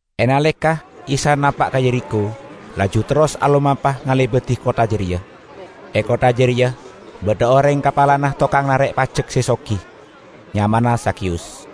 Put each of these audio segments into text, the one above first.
E naleka Isa napa' ka Yerikho, laju terros alomampa ngalebadi kottha jareya. E kottha jareya badha oreng kapalana tokang narek pajek se sogi. Nyamana Zakheyus.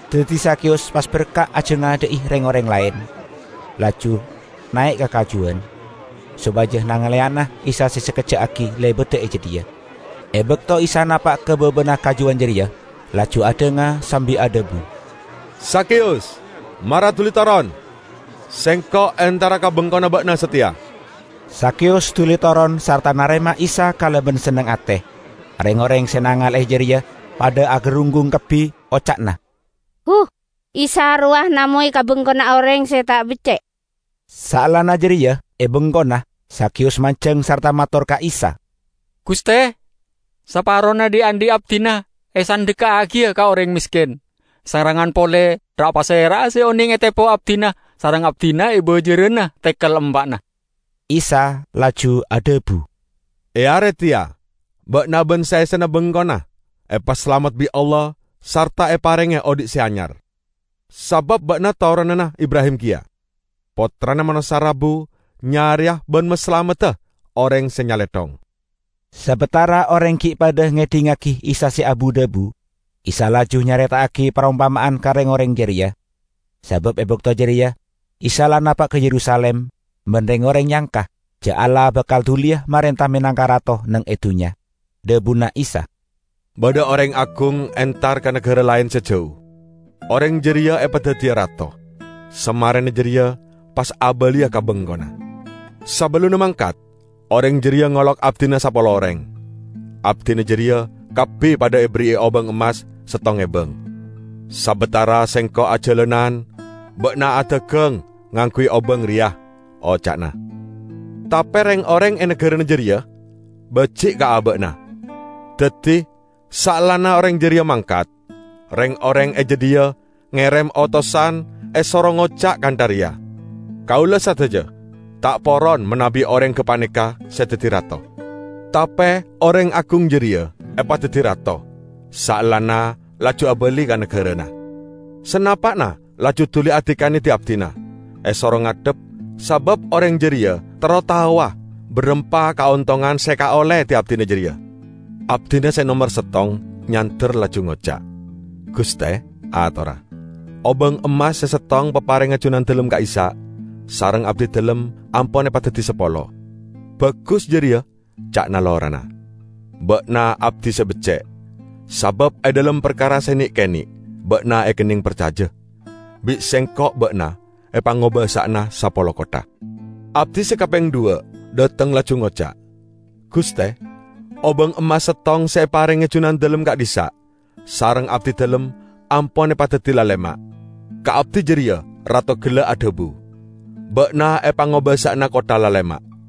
Daddi Zakheyus pas berka' ajangadha'i reng-oreng laen, laju nae' ka kajuwan, sopaja nangaleyana Isa se sakejja' aggi' lebada e jadhiya. E bakto Isa napa' ka babana kajuwan jareya, laju adhanga sambi adhabu, "Zakheyus, mara duli toron, Sengko' entara ka bengkona ba'na sateya." Zakheyus duli toron sarta narema Isa kalaban senneng ate. Reng-oreng se nangale'e jareya padha agarunggung kabbi. Oca'na, "Huh! Isa rowa namoy ka bengkona oreng se ta' becce'!" Saellana jareya, e bengkona, Zakheyus manjeng sarta mator ka Isa, "Guste, saparona dhi'-andhi' abdina esandhekka'agiya ka oreng mesken; sarengngan pole ra'-pasera'a se oneng etepo abdina, sareng abdina ebajarana tekel empa'na." Isa laju adhabu, "E are teya ba'na ban saessena bengkona epasalamet bi' Allah sarta eparenge odhi' se anyar, sabab ba'na toronanna Ibrahim keya. Pottrana Manossa rabu nyareya ban masalamedda oreng se nyalethong." Sabatara oreng gi' padha ngedhingngagi Isa se abu-dhabu, Isa laju nyareta'agi parompama'an ka reng-oreng jareya. Sabab e bakto jareya Isa la napa' ka Yerusalim, ban reng-oreng nyangka ja' Allah bakal duliya marenta menangka Rato neng e dunnya. Dhabuna Isa, "Badha oreng agung entar ka nagara laen se jau; oreng jareya epadaddiya rato, samarena jareya pas abaliya ka bengkona. Sabellunna mangkat, oreng jareya ngolok abdina sapolo oreng. Abdina jareya kabbi padha eberri'i obang emmas settong ebang. 'Sabatara sengko' ajalanan, ba'na adagang ngangguy obang reya,' oca'na. Tape reng-oreng e nagarana jareya baji' ka aba'na. Daddi, saellana oreng jareya mangkat, reng-oreng e jadhiya ngerem otosan esoro ngoca' kantha reya, 'Kaula sadaja ta' poron manabi oreng gapaneka se daddi rato.' Tape oreng agung jareya epadaddi rato, saellana laju abali ka nagarana. Sanapa'na laju duli adikane di-abdina, esoro ngadhep, sabab oreng jareya terro taowa barampa kaontongan se ekaolle di-abdina jareya. Abdina se nomer settong nyander laju ngoca', 'Guste,' atorra, 'obang emmas se settong paparengnga junandalem ka'issa' sareng abdidalem ampon epadaddi sapolo.' 'Bagus jareya,' ca'na lorana, 'ba'na abdi se becce'! Sabab e dhalem parkara se ne'-kene' ba'na ekenneng parcaja, bi' sengko' ba'na, epangobasa'ana sapolo kottha.' Abdi se kapeng dhuwa' dhateng laju ngoca', 'Guste, obang emmas settong se eparenge junandalem ka'dhissa' sareng abdidalem ampon epadaddi lalema'.' Ka abdi jareya rato gella' adhabu, 'Ba'na epangobasa'ana kottha lalema'.'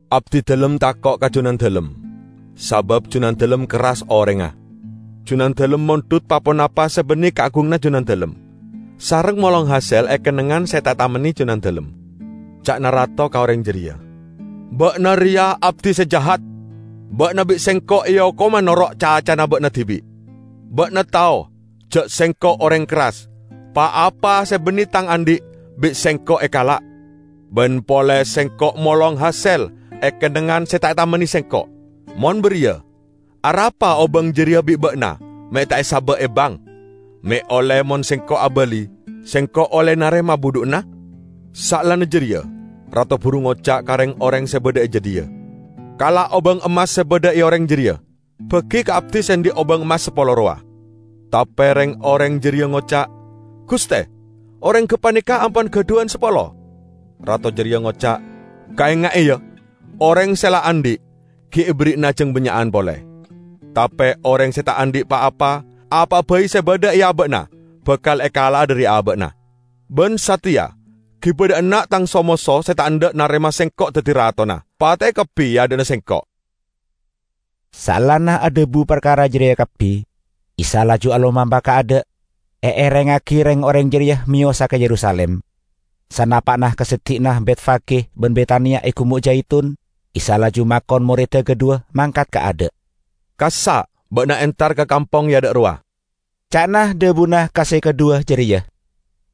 Abdidalem tako' ka junandalem, sabab junandalem kerras orengnga. Junandalem mondhut pa-ponapa se banne kaagunganna junandalem, sareng molong hasel e kennengngan se ta' etamenne junandalem.' Ca'na rato ka oreng jareya, 'Ba'na reya abdi se jahat! Ba'na bi' sengko' eokoma noro' cacana ba'na dibi'. Ba'na tao ja' sengko' oreng kerras: pa-apa se banne tang andhi' bi' sengko' ekala', ban pole sengko' molong hasel e kennengngan se ta' etamenne sengko'. Mon bariya arapa obang jareya bi' ba'na me' ta' esaba' e bank, me' olle mon sengko' abali sengko' olle narema budhu'na?' Saellana jareya rato buru ngoca' ka reng-oreng se badha e jadhiya, 'Kala' obang emmas se badha e oreng jareya, bagi ka abdi se andhi' obang emmas sapolo rowa.' Tape reng-oreng jareya ngoca', 'Guste, oreng gapaneka ampon gadhuwan sapolo.' Rato jareya ngoca', 'Kaenga'e, ya: oreng se la andhi', gi' eberri'ana jang bannya'an pole. Tape oreng se ta' andhi' pa-apa, apa'a bai se badha e aba'na bakal ekala'a dhari aba'na. Ban sateya giba dha' enna' tang so-moso se ta' endha' narema sengko' daddi ratona. Pate'e kabbi e adha'na sengko'!' " Saellana adhabu parkara jareya kabbi Isa laju alomampa kaadha', eerengngagi reng-oreng jareya meyosa ka Yerusalim. Sanapa'na ka seddi'na Betfage ban Betania e Gumo' Jaitun, Isa laju makon moredda kadhuwa mangkat kaadha'. "Kassa' ba'na entar ka kampong e adha' rowa," ca'na dhabuna ka se kadhuwa jareya;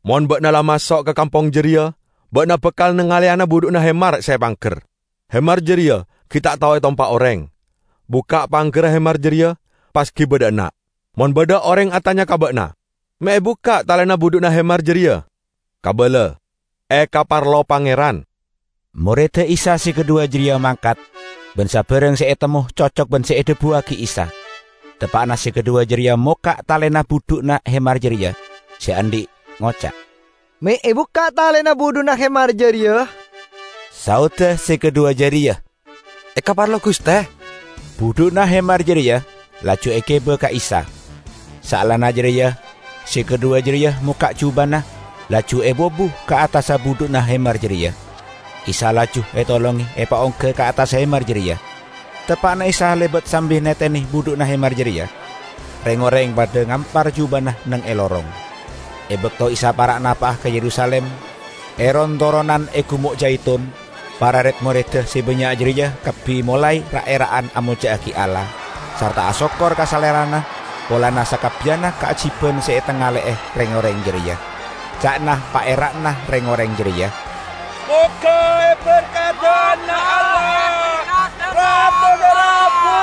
"mon ba'na la maso' ka kampong jareya ba'na bakal nangaleyana budhu'na hemar se epangger. Hemar jareya gi' ta' tao etompa' oreng. Bukka' panggerra hemar jareya pas giba dha' enna'. Mon badha oreng atanya ka ba'na, 'Me' ebukka' talena budhu'na hemar jareya?' kabala, 'Ekaparlo Pangeran.' " Moredda Isa se kadhuwa jareya mangkat, ban sabarang se etemmo cocok ban se edhabuwagi Isa. Teppa'na se kadhuwa jareya mokka' talena budhu'na hemar jareya, se andhi' ngoca', "Me' ebukka' talena budhu'na hemar jareya?" Saodda se kadhuwa jareya, "Ekaparlo Guste." Budhu'na hemar jareya laju egiba ka Isa. Saellana jareya, se kadhuwa jareya mokka' jubana, laju epobu ka attassa budhu'na hemar jareya; Isa laju etolonge epaongga ka attassa hemar jareya. Teppa'na Isa lebat sambi netene budhu'na hemar jareya, reng-oreng padha ngampar jubana neng e lorong. E bakto Isa para' napa'a ka Yerusalim, e ron-toronan e Gumo' Jaitun, para red-moredda se bannya' jareya kabbi molae ra'-era'an amolja'agi Allah sarta asokkor ka Salerana polana sakabbiyanna kaajiban se etangale'e reng-oreng jareya. Ca'na paera'na reng-oreng jareya, "Moga eberkadana Allah Rato se rabu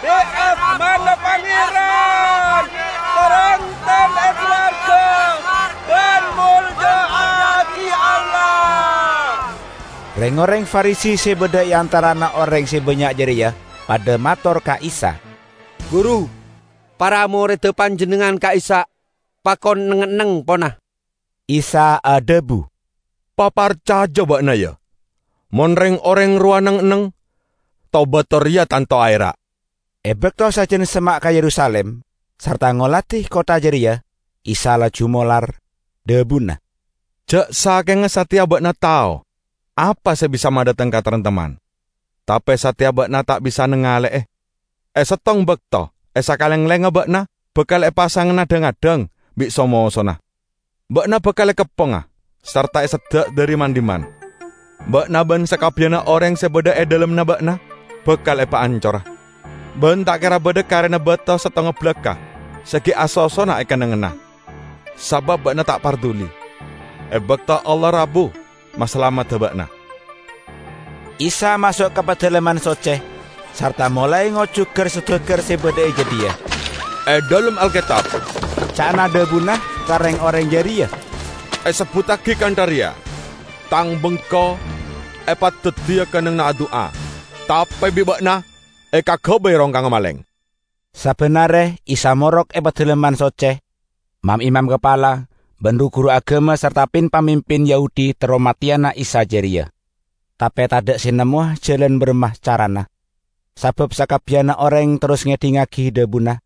bit asmana Pangeran! Taremtem e sowarga ban molja'agi Allah!" Reng-oreng Farisi se badha e antarana oreng se bannya' jareya padha mator ka Isa, "Guru, para moredda Panjennengngan ka'issa' pakon neng-enneng, pona!" Isa adhabu, "Paparcaja ba'na, ya! Mon reng-oreng rowa neng-enneng, to-bato reya tanto aera'." E bakto sajan semma' ka Yerusalim, sarta ngoladi kottha jareya, Isa laju molar. Dhabuna, "Ja' sakenga sateya ba'na tao apa se bisa madhateng kataremtemman! Tape sateya ba'na ta' bisa nangale'e. E settong bakto e sakalenglengnga ba'na bakal epasangana dhang-addhang bi' so-mosona; ba'na bakal ekepponga sarta eseddhek dhari man-dhimman. Ba'na ban sakabbiyanna oreng se badha e dhalemmanna ba'na bakal epaancora; ban ta' kera badha karena bato settonga balakka' se gi' asosona e kennengnganna, sabab ba'na ta' parduli e bakto Allah rabu masalamedda ba'na!" Isa maso' ka Padalemman Socce, sarta molae ngojuk gar-sodagar se badha e jadhiya. "E dhalem Alketab," ca'na dhabuna ka reng-oreng jareya, "esebbuttagi kantha reya, 'Tang Bengko epadaddiya kennengnganna adu'a.' Tape bi' ba'na ekagabay rongkangnga maleng!" Sabban are Isa morok e dhalem Padalemman Socce. Mam-imam kapala, ban ru-guru agama sarta pin-pamimpin Yahudi terro mateyana Isa jareya, tape tadha' se nemmowa jalan baramma carana, sabab sakabbiyanna oreng terros ngedhingngagi dhabuna,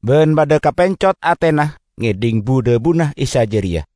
ban padha kapencot atena ngedhing bu-dhabuna Isa jareya.